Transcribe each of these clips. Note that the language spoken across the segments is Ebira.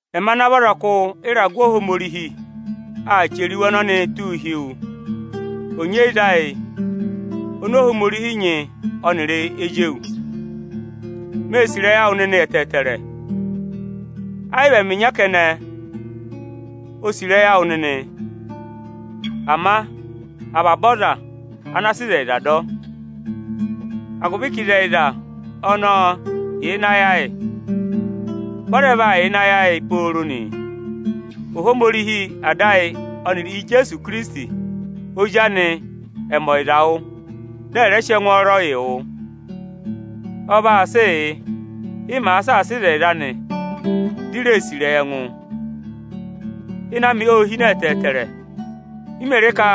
Ẹmị ana vị ọzọkụ ịragụ Ohomorihi aa chẹrẹ iwe ọnọnịị tụ́ụ hi wu, onyeyiza ayị ọnị Ohomorihi nyị ọnịrị ezi anị. Mée sì ịrẹyị awụ nịnị ẹtẹẹtẹrẹ. Ẹ yị vị ẹmị ịnya kẹnẹ o sì ịrẹyị awụ nịnị, ama avaba aza ana sị ịzẹyịza dọ. Agụvị ka ịzẹyịza ọnọọ yà ịnị ayị ayị, vị ọ rẹ vaa yà ịnị ayị ayị pooro nị. Ohomorihi Ada ayị ọnịrị Ozi anị Ijeesu Ikirisiti ẹ̀ mẹ ọyịza yị yị, dị ẹ̀ rẹ sị ẹngwọọrọ yị yị. Ọ vaa sịị yị ị màa saasa ịzẹyịza anị, di i ree sì ịrẹyị ẹngụ. Ịnẹ amị ô hine ẹtẹẹtẹrẹ m mè re ka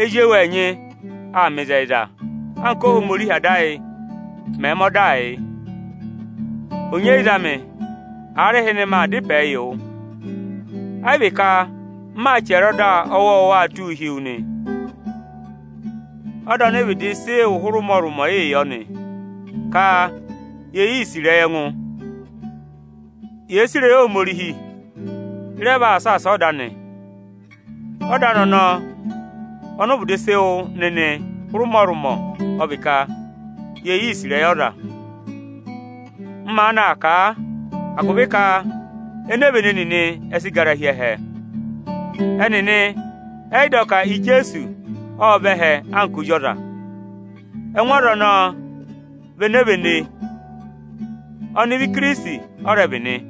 ezi ewu ẹnyị aa mẹ ịzẹyịza anka Óhomorihi Ada ayị mẹ̀ mẹẹ ọdaa yị. Onyeyiza amị, aarịhịnị maa dá ịpẹẹ wụ; ẹ́ yị vị ka m maa chẹrẹ ọda ọwọọwa tụ́ụ hi wu nị. Ọda ọnị ị vịdị sị wụ́ hụrị ụmọrụmọ yịị yọ nị, ka ye sì ịrẹyị ẹngụ. Yèe sì ịrẹyị Ohomorihi, ị rẹ vaa saasa ọda anị. Ọda anị ọnọọ ọnị ụ vịdị sị wụ nịnị hụrị ụmọrụmọ ọ vị ka yee sì ịrẹyị ọza nị. M maanị aa kà a agụvị ka enevene nịnị ẹ sị gara hi ẹhẹ. Ẹnịnị ẹ yị dọ ka Ijeesu ộ vẹ ẹhẹ anka ọza. Ẹngụ aza ẹnẹẹ vị enevene, ọnịvị Ikirisiti ẹ rẹ vị nị.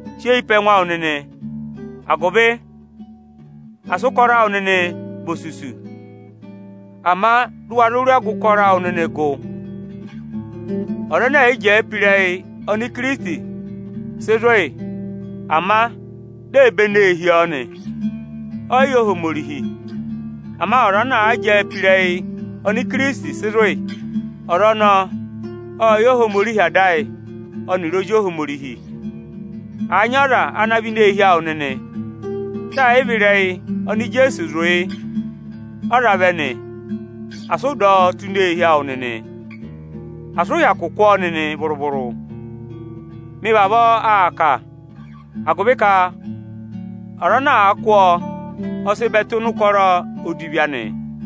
Sị eyi pe ẹngụ awụ nịnị agụvị asị ụkọrọ awụ nịnị na vị osusu, ama dị ụ wa zụ rị ọgụ ụkọrọ awụ nịnị gụ. Ọza ẹnẹ ẹ̀ yị jẹẹ pe ịrẹyị ọnị Ikirisiti sị zụ̀ yị, ama di ee benee hi ọ nị, ọ yị yẹ Ohomorihi. Ama ọza ana àa jẹẹ pe ịrẹyị ọnị Ikirisiti sị zụ̀ yị, ọza ọnọọ ọ́ọ yẹ Ohomorihi Ada ayị ọnịrị Ozi Ohomorihi nị. Àa nyị ọza ana vẹ ini eehi awụ nịnị, dị ẹ̀ yị vị ịrẹyị ọnị Ijeesu sị zụ̀ yị ọ za vẹ nị, asị ụ dọ ọ tụ́ ini eehi awụ nịnị, asị ụ hyakụ kụ́ ọ nịnị vụrụ-vụrụ. Mị vavọọ aa kà a agụvị ka ọza ana àa kụ́ ọ, ọ sị bẹ tụ́ ịnị ụkọrọ odivi anị.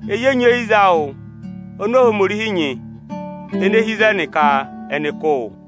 Ezi onyeyiza awụ ọnị Ohomorihi nyị, ene hi ịzẹnị, ka ẹnị kụ́ wụ.